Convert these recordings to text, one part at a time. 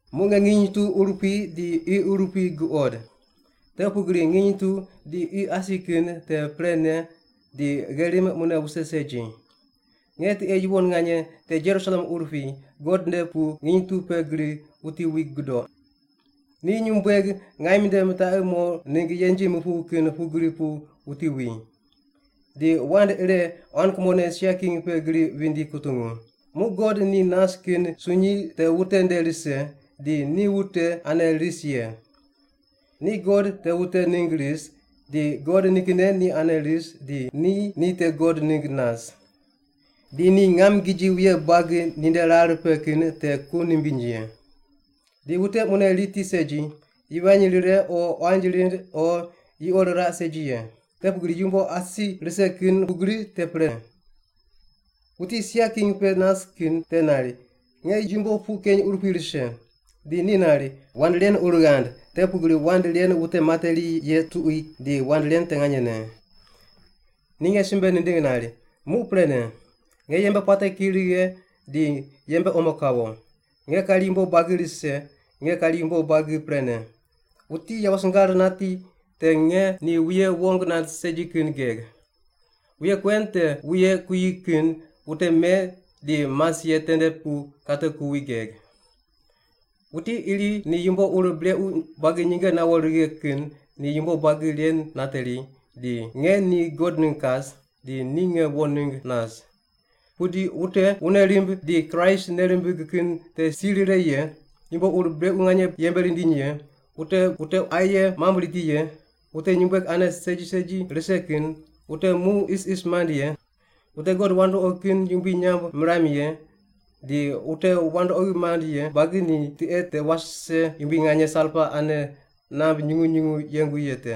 Muq nge nginy tu urupui di qi urupui guqod. Te pugri nginy tu di qi asi kin te prene di gherim mune wuse segi. Nge tiqe yuwon nganye, te Jerusalem urupui, God nde pu nginy tu pe gri wuti wi gudoq. Ni nyumbueg ngaim nde mitaqi mo ningg yenji mupuw kin pugri pu wuti wi. Di wand ire quan kumone sia king pe gri vindi kutungu, “Muq God ni nas kin sunyi te wute nde rise, di ni wute ane ris ye. Ni God te wute ningg ris, di God nikinne ni ane ris di ni ni te God ningg nas. Di ni ngam giji wuye buagi ninde rar pe kin te ku nimbiny ye. Di wute mune riti segi, yivany rire o quanji rind o yuqo riraq segi ye. Te pugri yumbo asi rise kin pugri te pre.” Wuti sia king pe nas kin te nari, “Nge yumbo puq keny urupui rise.” Di ni nari, “Wand ren ur ghand, te pugri wand ren wute materi ye tuqui di wand ren te nganyene.” Ni nge simbe nindigh nari, “Muq prene. Nge yembe puate ki righe di yembe omo kawo. Nge kari yumbo buagi rise; nge kari yumbo buagi prene. Wuti yawo singar nati te nge ni wuye wong nand segi kin geg. Wuye kuen te wuye kuyi kin wute me di mas ye tende pu kate kuwi geg. Wuti iri ni yumbo ur brequ buagi nyinge nawo righe kin ni yumbo buagi ren nateri, di nge ni God ningg kas, di ni nge wo ningg nas. Pudi wute wune rimb di Kraist nei rimbig kin te si rire ye, yumbo ur brequ nganye yembe rindiny ye, wute wute aye mamb riti ye, wute nyumbueg ane segi segi rise kin, wute mu isis mand ye, wute god wandoqi kin yumbui nyamb miram ye, di wute wandoqi mand ye buagi ni tiqe te wase yumbui nganye salpa ane namb nyungu nyungu yengu ye te.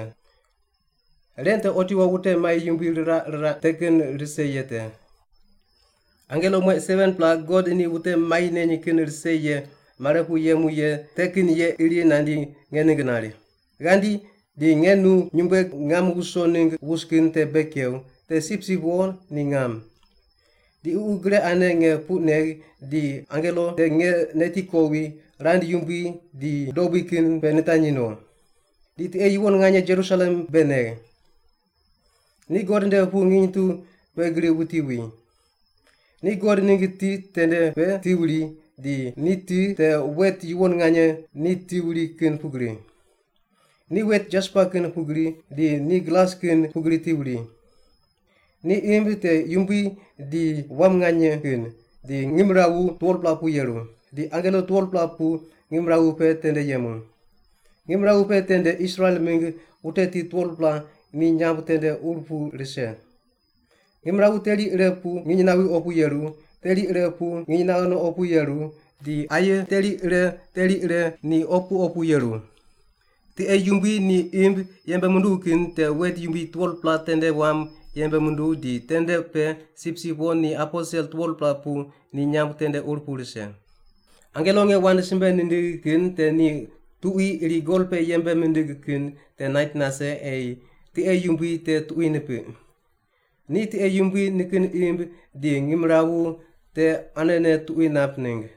Ren te otiwo wute mai yumbui riraq riraq te kin rise ye te.” Angelo mueq 7-pela God ni wute mai neny kin rise ye mare pu yemu ye te kin ye iri nandi nge ningg nari, “Ghandi, di nge nu nyumbueg ngam wuso ningg wus kin te bei kew, te Sipsip Wo ni ngam.” Di Ququ gre ane nge puq negh di angelo te nge neti kowi rand yumbui di dobui kin pe nitanyi no. Di tiqe yuwon nganye Jerusalem bei negh. Ni God nde pu nginy tu pe gri wuti wi. Ni God ningg ti tende pe ti wuri, di ni ti te wet yuwon nganye ni ti wuri kin pugri. Ni wet jaspa kin pugri di ni glas kin pugri ti wuri. Ni imb te yumbui di wam nganye kin, di ngimrawu 12-pela pu yeru. Di angelo 12-pela pu ngimrawu pe tende yemu. Ngimrawu pe tende Israel mingg wute tit 12-pela ni nyamb tende ur pu rise. Ngimrawu teri ire pu nginy nawi opu yeru, teri ire pu nginy naghe no opu yeru, di aye teri ire teri ire ni opu opu yeru. Tiqe yumbui ni imb yembe munduw kin te wet yumbui 12-pela tende wam yembe munduw di tende pe Sipsip Wo ni aposel 12-pela pu ni nyamb tende ur pu rise. Angelo nge wand simbe nindigh kin te ni tuqui iri gol pe yembe mindig kin te nait nase ei tiqe yumbui te tuqui nipiq. Ni tiqe yumbui nikin imb di ngimrawu te anene tuqui nap ningg.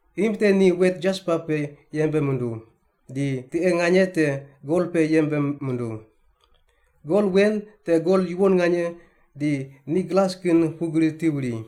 Imb te ni wet jaspa pe yembe munduw, di tiqe nganye te gol pe yembe munduw. Gol wen te gol yuwon nganye di ni glas kin pugri ti wuri.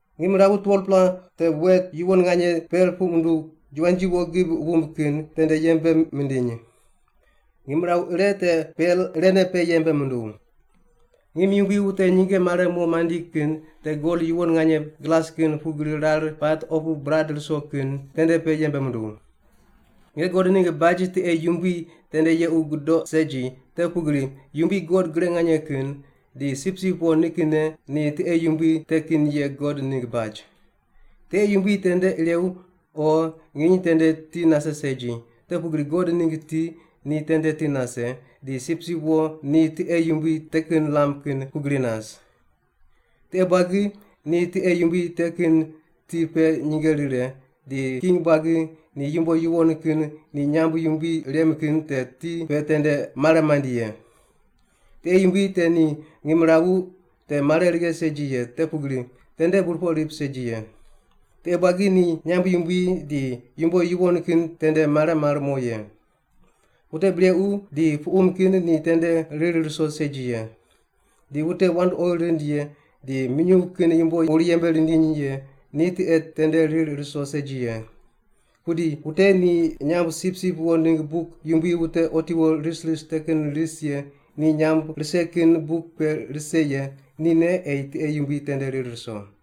Ngimrawu 12-pela te wet yuwon nganye pel puq munduw, juwanji wo gib wumb kin, tende yembe mindiny. Ngimrawu ire te pel irene pe yembe munduw. Ngim yumbui wute nyinge mare mo mandi kin te gol yuwon nganye glas kin pugri rar pat opu burad ruso kin tende pe yembe munduw. Nge God ningg baj tiqe yumbui tende yequ gudoq segi, te pugri Yumbui God Gre Nganye Kin di Sipsip Wo nikinne ni tiqe yumbui te kin ye God ningg baj. Tiqe yumbui tende irew o nginy tende ti nase segi, te pugri God ningg ti ni tende ti nase, di Sipsip Wo ni tiqe yumbui te kin lam kin pugri nas. Tiqe buagi ni tiqe yumbui te kin ti pe nyinge rire, di king buagi ni yumbo yuwon kin ni nyamb yumbui rem kin te ti pe tende mare mandi ye. Tiqe yumbui te ni ngimrawu te mare righe segi ye, te pugri tende burpoq rip segi ye. Tiqe buagi ni nyamb yumbui di yumbo yuwon kin tende mare mar mo ye. Wute brequ di puqum kin ni tende rir ruso segi ye. Di wute wandoqi rind ye di minyuw kin yumbo ur yembe rindiny ye ni tiqe tende rir ruso segi ye. Pudi wute ni nyamb Sipsip Wo ningg buk yumbui wute otiwo ris ris te kin ris ye ni nyamb rise kin buk pe rise ye nine ei tiqe yumbui tende rir ruso.